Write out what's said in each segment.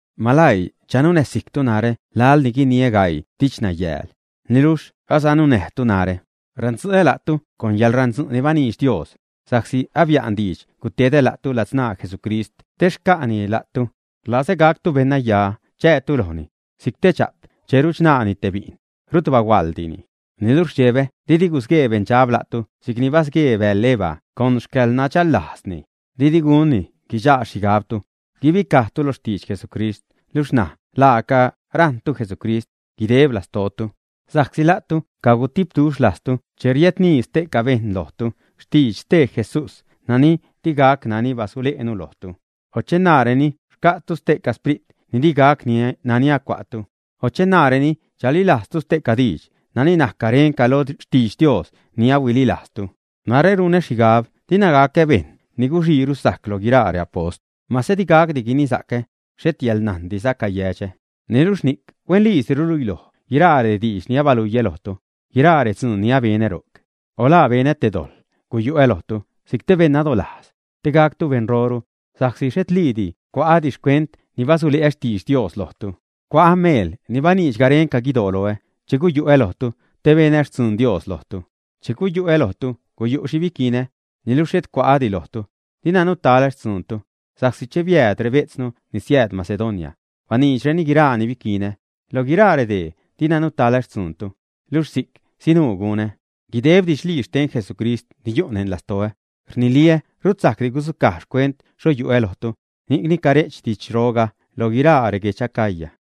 Maläii chanunäsijctu narä laḻ ni guiniä gaii didxnayäle', niluxh asanunäjtu narä. Randzu'ä la'tu con yäḻrandzu' ni baniidx Dios, sa'csi abia'n diidx gutedä la'tu ladzṉaa Jesucrist te xca'ni la'tu. Rlazä gactu beṉnaya chäätu lojni, si'c te dxa'p che ruchṉaani te bi'n, rut bahuaḻdini. Niluxh rdxebä didi gusguee beṉdxab la'tu si'c ni basguee bäḻ Eva con xcäḻnadxällajzni. Didi gunni guichaa xhigabtu, guibicajtu lo xtidx Jesucrist luxh ṉaj laaca rajṉpactu Jesucrist, guideb lastootu. Sa'csi la'tu cagutipduxh lajztu che riädnii ste'ca bejṉ lojtu xtidx stee Jesús nani digac nani bisule'nu lojtu; o che naareni xca'tu stee sprit ni digac nani acua'tu; o che naareni chalilajztu ste'ca diidx nani najc garenca lo xtidx Dios ni ahuililajztu. Narä runä xhigab dina gacä bejṉ ni guxiiru sajc loj guiraa reapost. Mase di gacdi guinisa'cä, xhet yäḻnajndiza cayädxä; niluxh ni'c huenliisi rluiloj guiraa rediidx ni abaluiä lojtu, guiraa redzuun ni abenä ro'c. O ¿la benä te dojḻ guyu'ä lojtu si'c te beṉ nadolajz, te gactu beṉroru, sa'csi xhetliidi cua'ädi xcuent ni basule'ä xtidx Dios lojtu? Cua'ä meel ni baniidx garenca guidoo loä che guyu'ä lojtu, te benä xtzun Dios lojtu. Che guyu'ä lojtu guyu' xhi biquinä, niluxh xhet cua'ädi lojtu, dina nutaḻä xtzuuntu. Sa'csi che biääd rebejtznu ni siääd Macedonia, baniidxreni guiraa ni biquinä. Loj guiraa redee dina nutaḻä xtzuuntu, luxh si'c sinuu gunä. Guideb didxlii xten Jesucrist ni yu' neṉ lastoä, rniliä rut sajcdi gudzucaj xcuent xho yuä lojtu, ni'cni care'ch didxroga lo guiraa reguedx Acaya.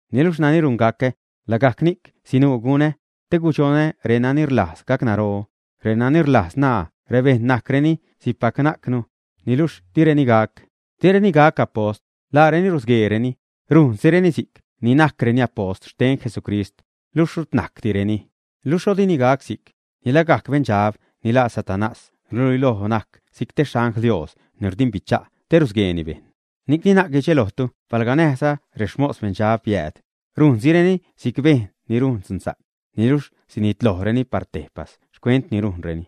Niluxh nani rungacä, lagajc ni'c sinuu gunä, te gudxonä renani rlajz gacnaro, renani rlajz naa rebejṉ najcreni si'cpac najcnu, niluxh direni gac. Direni gac apost, laareni rusgueereni, rujnsireni si'c ni najcreni apost xten Jesucrist, luxh rut najcdireni. Luxh xho dini gac si'c, ni lagajc beṉdxab ni laa Satanás ruluiloj si'c te xangl Dios ni rdimbicha' te rusgueeni bejṉ. Ni'cni na'c guidxelojtu palga näjza rexmos beṉdxab riääd, rujnsireni si'c bejṉ ni rujn dzunsa'c, niluxh sinitlojreni par tejpas xcuent ni rujnreni.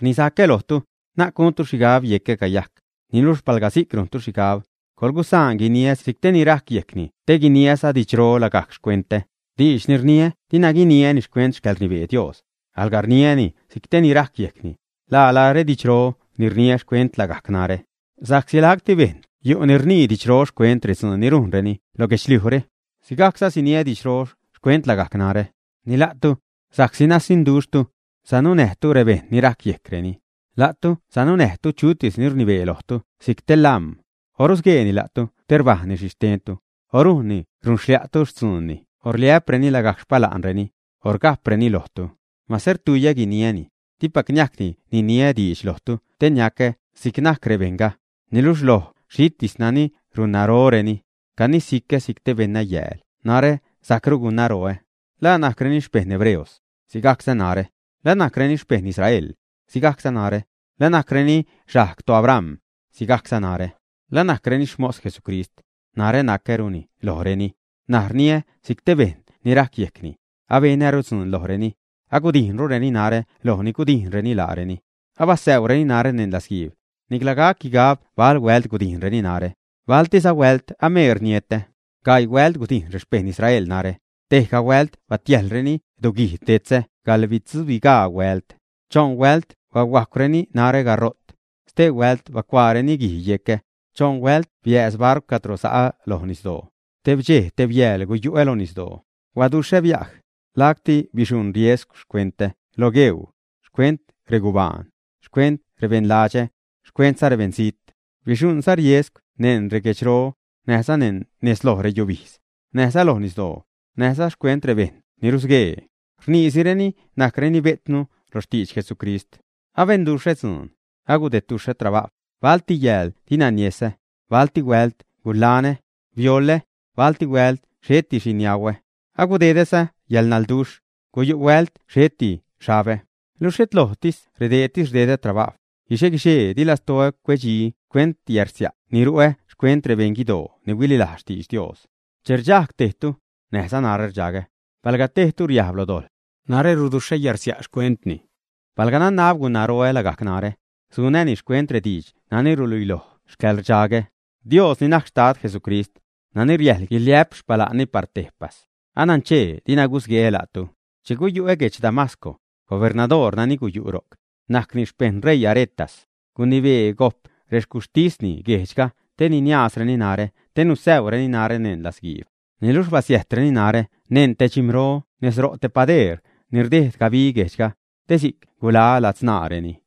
Rnisacä lojtu, na'c guntu xhigab yecä cayajc, niluxh palga si'c rujntu xhigab, coḻgusaanza guiniä si'c te ni rajc yejcni te guniäza didxro lagajc xcuentä. Diidx ni rniä dina guiniäni xcuent xcäḻrnibee Dios, alga rniäni si'c te ni rajc yejcni, lala redidxro ni rniä xcuent lagajc narä. Sa'csi lacti bejṉ yu' ni rnii didxro xcuent redzuun ni rujnreni lo guedxliujre, sigajcza siniä didxro xcuent lagajc narä. Ni la'tu, sa'csi nasiṉduxhtu, sanunäjtu rebejṉ ni rajc yejcreni. La'tu sanunäjtu chutis ni rnibee lojtu si'c te lam̲, o rusguee la'tu te rbajnreni xhi xtentu, o rujnni runxlia'tu xtzuunni o rliä'preni lagajc xpala'reni, o rga'preni lojtu. Mase rtuiyä guniäni, dipac niajcdi niniä diidx lojtu te niacä si'c najc rebejṉga. Niluxh loj xhitis nani runnaroreni, (canisicä si'c te beṉnayääl) narä sajcru gunnaroä. ¿La najcreni xpejṉ hebreos? Sigajcza narä. ¿La najcreni xpejṉ Israel? Sigajcza narä. ¿La najcreni xajg toAbram? Sigajcza narä. ¿La najcreni xmos Jesucrist? Narä nacäruni lojreni. N̲aj rniä si'c te bejṉ ni rajc yejcni. Abenäru dzuun lojreni, agudijnrureni narä loj ni gudijnreni laareni, abasäurureni narä neṉ latzguiib, nicla gac guigab bal huält gudijnreni narä; baltiza huält ameer nietä. Gaii huält gudijn rexpejṉ Israel narä, tejga huält batiäjlreni duguijd detzä gaḻbitzubigaa huält. Choṉ huält bahuajcwreni narä garo't; stee huält bacuaareni guij yecä; choṉ huält biääz barcw cadro sa'ä loj nisdoo; teb dxej, teb yääl guyu'ä lo nisdoo. Huaduxhä biaj, lacti bixuṉ riesgw xcuentä lo gueuu, xcuent regubaan, xcuent rebeṉladxä, xcuentza rebeṉzijt. Bixuṉza riesgw neṉ reguedxro, näjza nez lo reyubijdz, näjza lo nisdoo, näjza xcuent rebejṉ ni rusguee, rniisireni najcreni bejtznu lo xtidx Jesucrist. Abenduxhä dzuun, agudedduxhä trabajw, balti yääl dina niesä, balti huält gulanä, bioḻä, balti huält xheti xhi niauä; agudedäza yäḻnalduxh; guyu' huält xhetiza xhabä. Luxh xhet loj redeetis rdedä trabajw; guixe-guixee di lastoä cuedxi xcuent yärsia' ni ru'ä xcuent rebeṉ guidoo ni huililajz xtidx Dios. Che rdxajg tejtu, näjza narä rdxagä. Palga tejtu riajb lo dojḻ, narä ruduxhä yärsia' xcuentni. Palga nanab gunnaroä lagajc narä, sunäni xcuent rediidx nani ruluiloj xcäḻrdxagä. Dios ni najc Xtad Jesucrist, nani riäjl guiliä'p xpala'nni par tejpas, ananchee dina gusgueä la'tu. Che guyu'ä guedx Damasco, gubernadoor nani guyu' ro'c, najcni xpejṉ ṟeii Aretas, gunibee gojp rexcuxhtisni guejdxga te niniaazreni narä te nisäureni narä neṉ latzguiib. Niluxh basiäjtreni narä neṉ te dxim̲ro nez ro' te padeer ni rdejd gabi guejdxga, te si'c guḻaä ladzṉaareni.